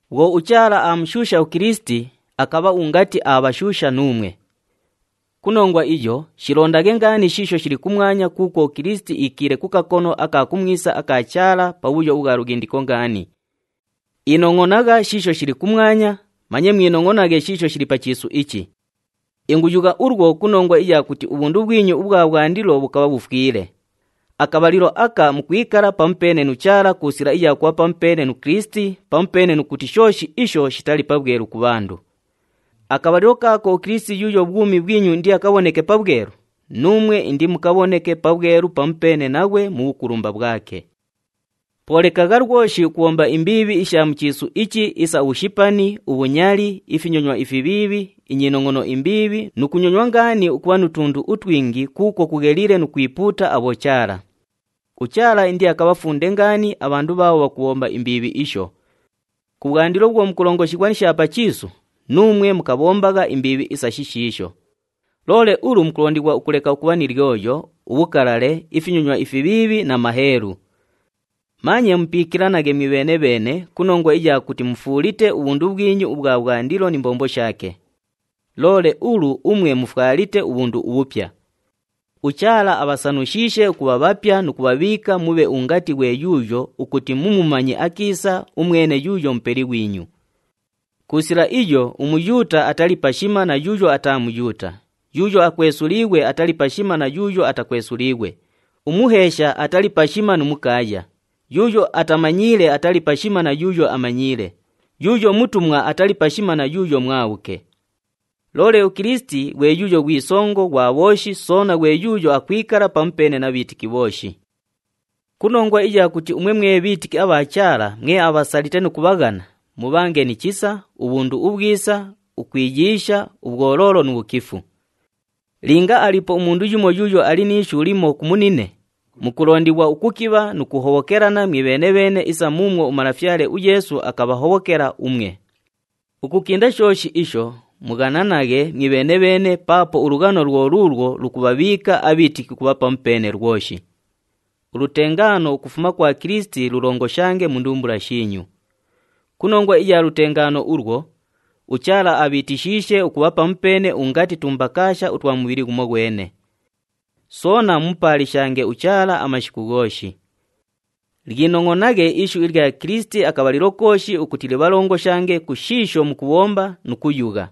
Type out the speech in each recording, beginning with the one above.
Bhwo uChaala aamushuusha uKilisiti, akabha ungati aabhashuusha nuumwe. Ku nongwa iyo, shilondaghe ngaani shiisho shili kumwanya kuukwo uKilisiti iikiile ku kakono aka kumwisa aka Chaala, pabhuyo ubhwa lughindiko ngaani. Inongʼonagha shiisho shili kumwanya, manye mwinongʼonaghe shiisho shili pa chiisu ichi. Inguyugha ulwo ku nongwa iya kuti ubhundu bhwinyu ubhwa bhwandilo bhukabha bhufwile. Akabhalilo aka mukwikala pamupeene nu Chaala ku sila iya kubha pamupeene nu Kilisiti, pamupeene nu kuti shooshi isho shitali pabhwelu ku bhandu. Akabhalilo kaako uKilisiti yuuyo bhwumi bhwinyu indiakabhoneke pabhwelu, nuumwe indimukabhoneke pabhwelu pamupeene naghwe mu bhukulumba bhwake. Po lekagha lwoshi ukubhomba imbiibhi isha mu chiisu ichi isa ubhushipani, ubhunyali, ifinyonywa ifibhiibhi, inyinongʼono imbiibhi nu kunyonywa ngaani ukubha nu tundu utwingi kuukwo kugheliile nu kwipuuta abhochaala. UChaala indiakabhafunde ngaani abhandu bhaabho bhakubhomba imbiibhi isho. Kubhwandilo bhwo mukulongoshighwa ni sha pa chiisu, nuumwe mukabhombagha imbiibhi isa shishiisho. Loole ulu mukulondighwa ukuleka ukubha ni lyoyo, ubhukalale, ifinyonywa ifibhiibhi na maheelu. Manye mupiikilanaghe mwibheene-bheene ku nongwa iya kuti mufuulite ubhundu bhwinyu ubhwa bhwandilo ni mbombo shaake. Loole ulu umwe mufwalite ubhundu ubhupya. UChaala abhasanushiishe ukubha bhapya nu kubhabhiika mubhe ungati ghwe yuuyo ukuti mumumanye akiisa umwene yuuyo Mupeli ghwinyu. Ku sila iyo, uMuyuuta atali pashima na yuuyo ataa Muyuuta, yuuyo akwesuliighwe atali pashima na yuuyo atakwesuliighwe, umuheesha atali pashima nu mukaaya, yuuyo atamanyiile atali pashima na yuuyo amanyiile, yuuyo mutumwa atali pashima na yuuyo mwabhuke. Loole uKilisiti ghwe yuuyo ghwi songo ghwa bhooshi soona ghwe yuuyo akwikala pamupeene na bhiitiki bhooshi. Ku nongwa iya kuti umwe mwe bhiitiki abha Chaala, mwe abhasalite nu kubhaghana, mubhange ni chisa, ubhundu ubhwisa, ukwiyiisha, ubhwoloolo nu bhukifu. Linga aliipo umundu yumo yuuyo ali ni ishu limo ku munine, mukulondighwa ukukibha nu kuhobhokelana mwibheene-bheene isa muumwo uMalafyale uYeesu akabhahobhokela umwe. Ukukinda shooshi isho, mughananaghe mwibheene-bheene paapo ulughano lwo luulwo lukubhabhiika abhiitiki ukubha pamupeene lwoshi. Ulutengaano ukufuma kwa Kilisiti lulongoshange mu ndumbula shiinyu. Ku nongwa iya lutengaano ulwo, uChaala abhiitishiishe ukubha pamupeene ungati tumbakaasha utwa mubhili ghumoghwene. Soona mumupaalishange uChaala amashiku ghooshi. Lyinongʼonaghe ishu ilya Kilisiti akabhalilo kooshi ukuti libhalongoshange ku shiisho mukubhomba nu kuyugha.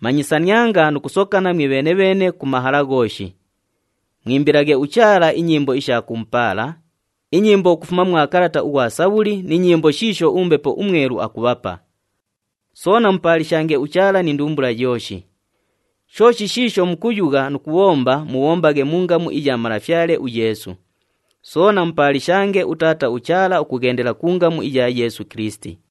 Manyisanianga nu kusokana mwibheene-bheene ku mahala ghooshi. Mwimbilaghe uChaala inyimbo isha kumupaala, inyimbo ukufuma mwa kalata ughwa Sabhuli ni nyimbo shiisho uMbepo uMwelu akubhapa. Soona mupaalishange uChaala ni ndumbula yooshi. Shooshi shiisho mukuyugha nu kubhomba mubhombaghe mu ngamu iya Malafyale uYeesu. Soona mupaalishange uTaata uChaala ukughendela ku ngamu iya Yeesu Kilisiti.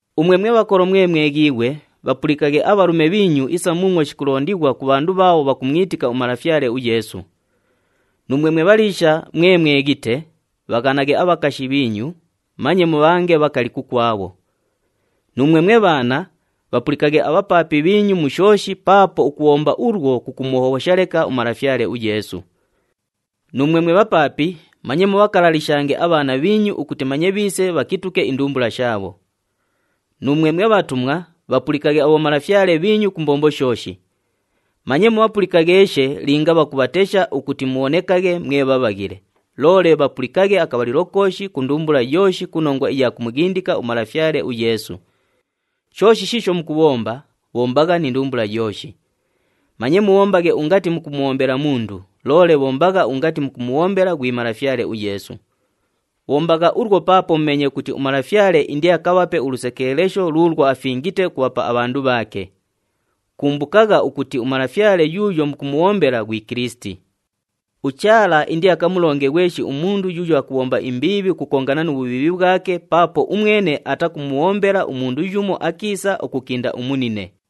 Umwe mwe bhakolo mwe mweghiighwe, bhapulikaghe abhalume bhiinyu isa muumwo shikulondighwa ku bhandu bhaabho bhakumwitika uMalafyale uYeesu. Nuumwe mwe bhaliisha mwe mweghite, bhaghanaghe abhakashi bhiinyu, manye mubhange bhakali kukwabho. Nuumwe mwe bhaana, bhapulikaghe abhapaapi bhiinyu mu shooshi paapo ukubhomba ulwo kukumuhobhosha leka uMalafyale uYeesu. Nuumwe mwe bhapaapi, manye mubhakalalishange abhaana bhiinyu ukuti manye bhiise bhakituke indumbula shaabho. Nuumwe mwe bhatumwa, bhapulikaghe abhomalafyale bhiinyu ku mbombo shooshi. Manye mubhapulikagheeshe linga bhakubhatesha ukuti mubhonekaghe mwe bhabhaghile, loole bhapulikaghe akabhalilo kooshi ku ndumbula yooshi ku nongwa iya kumughindika uMalafyale uYeesu. Shooshi shiisho mukubhomba, bhombagha ni ndumbula yooshi. Manye mubhombaghe ungati mukumubhombela mundu, loole bhombagha ungati mukumubhombela ghwi Malafyale uYeesu. Bhombagha ulwo paapo mumeenye ukuti uMalafyale indiakabhape ulusekeelesho luulwo afingite ukubhapa abhandu bhaake. Kumbukagha ukuti uMalafyale yuuyo mukumubhombela ghwi Kilisiti. UChaala indiakamulonge ghweshi umundu yuuyo akubhomba imbiibhi ukukongana nu bhubhiibhi bhwake paapo umwene atakumubhombela umundu yumo akiisa ukukinda umunine.